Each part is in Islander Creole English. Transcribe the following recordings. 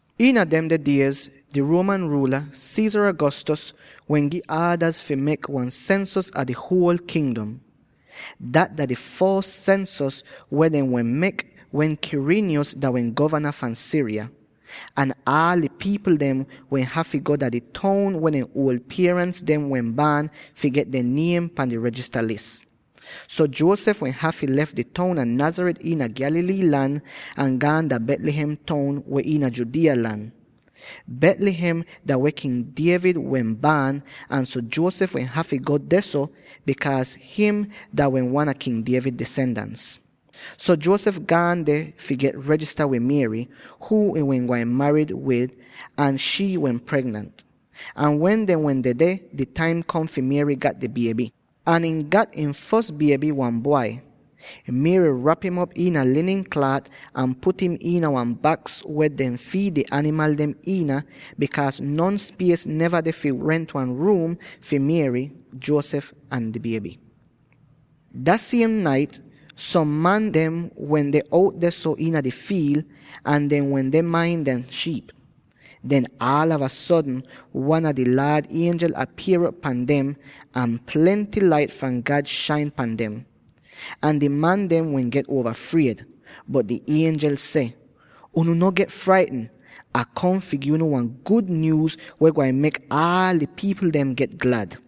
Iina demde diez di Roman ruula, Caesar Augustus, wehn gi aadaz fi mek wan sensos a di huol kingdom. Dat dah di fos sensos weh dehn wehn mek, wen Quirinius dah wehn govana fahn Syria. Ahn aal di pipl dem wehn hafy go dah di toun weh dehn uol pierans dem wehn baan fi get dehn niem pan di regista lis. So Joseph wehn hafy lef di toun a Nazareth iina Galilee lan, ahn gaan dah Bethlehem toun, weh iina Judea lan. Bethlehem dah weh King David wehn baan, ahn so Joseph wehn hafy go dehso, bikaaz ihn dah wehn wan a King David disendans. So Joseph gaan deh fi regista wid Mary —huu ihn wehn gwain marid wid— ahn shii wehn pregnant. Ahn wen dehn wehn dedeh, di taim kom fi Mary gat di bieby, ahn ihn gat ihn fos bieby, wan bwai. Mary rap im op iina linin klaat ahn put im iina wan baks weh dehn fiid di animal dem iina, bikaaz non spies neva deh fi rent wan ruum fi Mary, Joseph ahn di bieby. Dah siem nait, som man dehn wende out dehso iina di fiil, ahn dehn wende main dehn shiip. Den aalava sodn wan a di Laad ienjel apier'op pan dem, ahn plenty lait fahn God shain pan dem. Ahn di man dem get uova fried. Bot di ienjel seh, “Unu no get fraitn! Ah kom fi gi unu wan gud nyuuz, weh gwain mek aal di pipl dem get glad.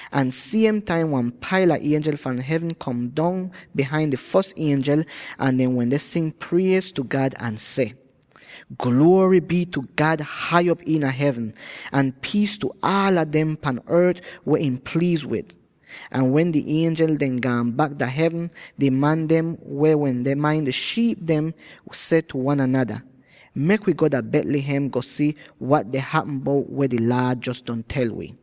Ahn siem taim wan paila ienjel fahn hevn kom dong bihain di fos ienjel, ahn dehn wende sing priez tu God ahn seh, “Gluory bii tu God hai op iina hevn, ahn piis tu aala dem pan ort weh ihn pliiz wid!” Ahn wen di ienjel dehn gaan bak dah hevn, di man dem weh wende main di shiip dem seh tu wan anada, “Mek wi go dah Bethlehem, go si wat deh hapm bout weh di Laad jos don tel wi.”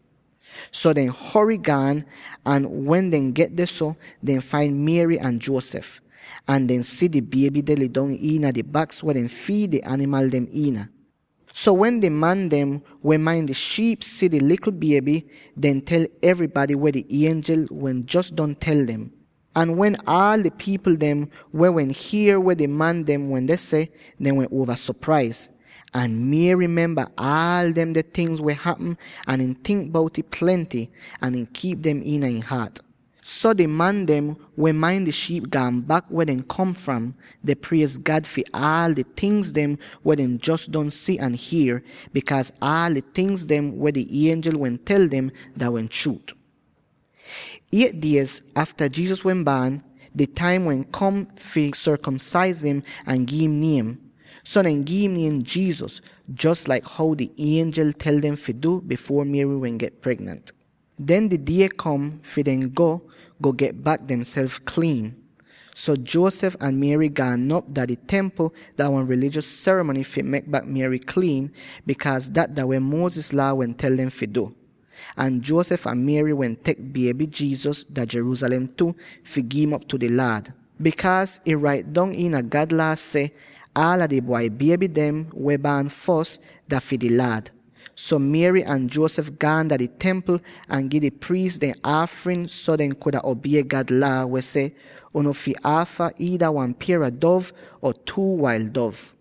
So dehn hory gaan, ahn wen dehn get dehso, dehn fain Mary ahn Joseph. Ahn dehn si di bieby deh lidong iina di baks weh dehn fiid di animal dem iina. So wen di man dem weh main di shiip si di likl bieby, dehn tel evrybady weh di ienjel dem wehn jos don tel dem. Ahn wen aal di pipl dem weh wehn hier weh di man dem wende seh, dehn wehn uova sopraiz. Ahn Mary memba aal demde tingz weh hapm, ahn ihn tink bout'ih plenty, ahn ihn kiip dem iina ihn haat. So di man dem weh main di shiip gaan bak weh dehn kom fram, deh priez God fi aal di tingz weh dehn jos don si ahn hier, bikaaz aal di tingz weh di ienjel wehn tel dem, dah wehn chruut. Eight diez afta Jesus wehn baan, di taim wehn kom fi sorkomsaiz im ahn gi'im niem; so dehn gi'im niem Jesus, jos laik how di ienjel tel dem fi du bifuor Mary wehn get pregnant. Den di die kom fi dehn go, go get bak demself kliin. So Joseph ahn Mary gaan op dah di Templ dah wan rilijos serimony fi mek bak Mary kliin, bikaaz dat dah weh Moses Laa wehn tel dem fi du. Ahn Joseph ahn Mary wehn tek bieby Jesus dah Jerusalem tu, fi gi'im op tu di Laad, bikaaz ih rait dong iina God Laa seh, “Aala di bwai bieby dem weh baan fos, dah fi di Laad.” So Mary ahn Joseph gaan dah di Templ ahn gi di priis dehn aafrin so dehn kuda obie God Laa, weh seh, “Unu fi aafa iida wan pier a dov or two wail dov.”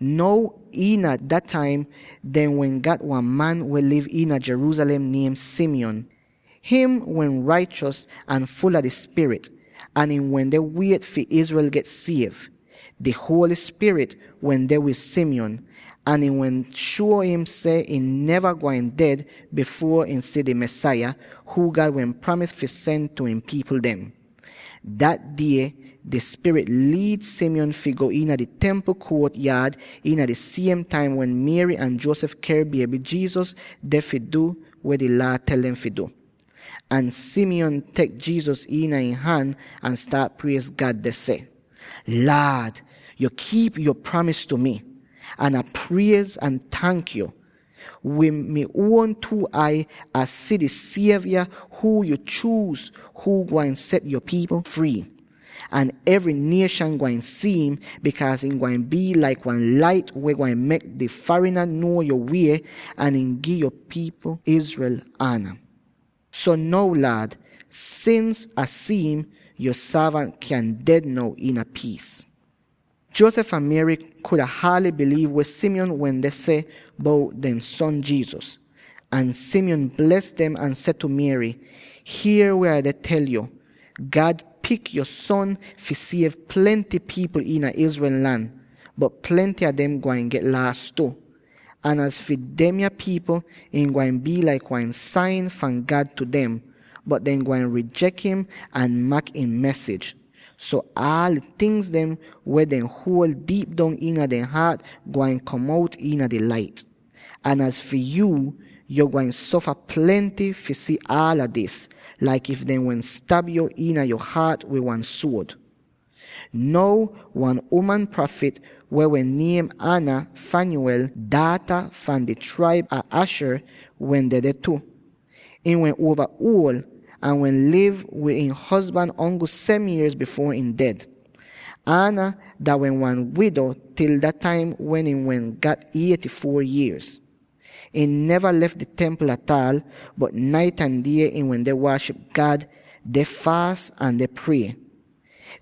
Now iina dah taim dehn wehn gat wan man, weh liv iina Jerusalem, niem Simeon. Ihn wehn raichos ahn ful a di Spirit, ahn ihn wende wiet fi Israel get siev. Di Holy Spirit wende wid Simeon, ahn ihn wehn shuo im seh ihn neva wehn gwain ded bifuor ihn si di Mesaya, huu God wehn pramis fi sen tu ihn pipl dem. Dat die di Spirit liid Simeon fi go iina di Templ kuot-yaad iina di siem taim wen Mary ahn Joseph ker bieby Jesus deh fi du weh di Laa tel dem fi du. Ahn Simeon tek Jesus iina ihn han ahn staat priez God deh seh: “Laad, yo kiip yo pramis tu mi, ahn Ah priez ahn tank yo! Wid mi uon two ai Ah si di Sievya huu yuu chuuz, huu gwain set yo pipl frii! Ahn evry nieshan gwain si'im, bikaaz ihn gwain bii laik wan lait, weh gwain mek di farina nuo yo wie, ahn gi'yo pipl Israel ana. So now, Laad, sins Ah si'im, yo sorvant kyan ded now iina piis.” Joseph ahn Mary kuda haaly biliiv weh Simeon wehn seh bout dehn son Jesus. Ahn Simeon bles dem ahn seh tu Mary, “Hier weh Ah deh tel yo: God pik yo son fi siev plenty pipl iina Israel lan, bot plenty a dem gwain get laas tu. Ahn az fi demya pipl, ihn gwain bii laik wan sain fahn God tu dem, bot dehn gwain rijek im ahn mak ihn mesij. So aal di tingz weh dehn huol diip dong iina dehn haat gwain kom out iina di lait. “Ahn az fi yuu, yo gwain sofa plenty fi si aala dis, laik if dehn wehn stab yu iina yo haat wid wan suod.” Now wan uman prafit weh wehn niem Anna —Phanuel daata fahn di traib a Asher— wehn dedeh tu. Ihn wehn uova uol, ahn wehn liv wid ihn hozban ongl seven yierz bifuor ihn ded. Anna dah wehn wan wido til dah taim wen ihn wehn gat eighty-four yierz. Ihn neva lef di Templ ataal, bot nait ahn die ihn wende waaship God, deh faas ahn deh prie.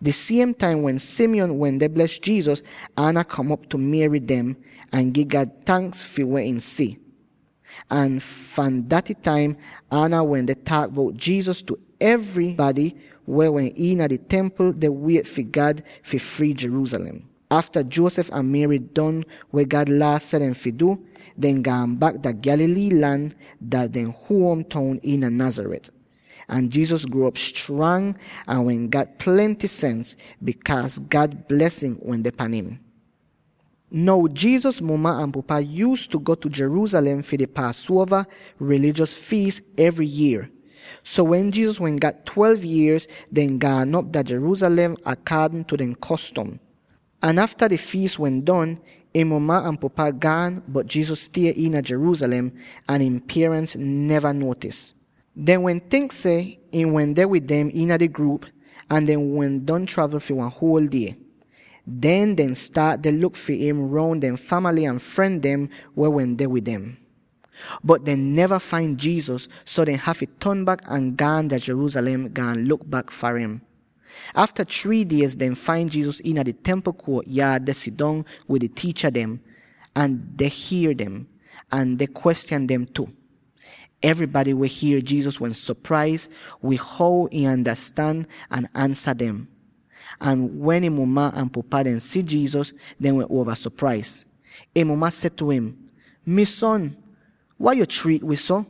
Di siem taim wen Simeon wende bles Jesus, Anna kom op tu Mary dem, ahn gi God tanks fi weh ihn si. Ahn fahn daty taim, Anna wende taak bout Jesus tu evrybady weh wehn iina di Templ deh wiet fi God fi frii Jerusalem. Afta Joseph ahn Mary don weh God Laa seh dem wehn fi du, dehn gaan bak dah Galilee lan dah dehn huom toun iina Nazareth. Ahn Jesus gruo'op strang, ahn wehn gat plenty sens; bikaaz God blesin wende pan im. Now Jesus muma ahn pupa yuuztu go Jerusalem fi di Paasuova rilijos fiis evry yier. So, wen Jesus wehn gat twelve yierz, dehn gaan op dah Jerusalem akaadn tu dehn kostom. Ahn afta di fiis wehn don, ihn muma ahn pupa gaan, bot Jesus stie iina Jerusalem, ahn ihn pierans dehn neva nuotis. Dehn wehn tink seh ihn wehn dedeh wid dem iina di gruup, ahn dehn wehn don travl fi wan huol die. Den dehn staat deh luk fi im roun dehn famaly ahn fren dem weh wende wid dem. Bot dehn neva fain Jesus, so dehn hafy ton bak ahn gaan dah Jerusalem, gaan luk bak far im. Afta three diez, dehn fain Jesus iina di Templ kuot-yaad, deh sidong wid di tiicha dem, ahn deh hier dem, ahn deh kwestyan dem tu. Evrybady weh hier Jesus wehn sopraiz wid how ihn andastan ahn ansa dem. Ahn wen ihn muma ahn pupa dem si Jesus, dehn wehn uova sopraiz. Ihn muma seh tu im, “Mi son, wai yo triit wi so?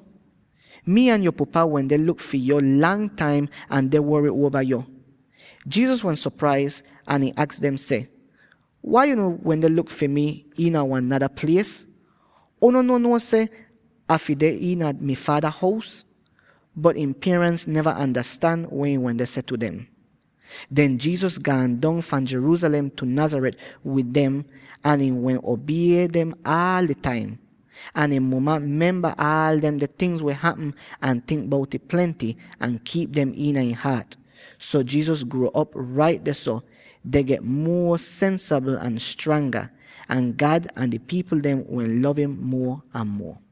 Mii ahn yo pupa wende luk fi yo lang taim ahn deh wory uova yo.” Jesus wehn sopraiz ahn ihn aks dem seh, “Wai unu wende luk fi mi iina wan nada plies? Unu no nuo seh Ah fi deh iina mai Faada hous?” Bot ihn pierans neva andastan weh ihn wende seh tu dem. Den Jesus gaan dong fahn Jerusalem tu Nazareth wid dem ahn ihn wehn obie dem aal di taim. Ahn ihn muma memba aal demde tingz weh hapm, ahn tink bout'ih plenty ahn kiip dem iina ihn haat. So Jesus gruo'op rait dehso, deh get muo sensabl ahn stranga; ahn God ahn di pipl dem wehn lov im muo ahn muo.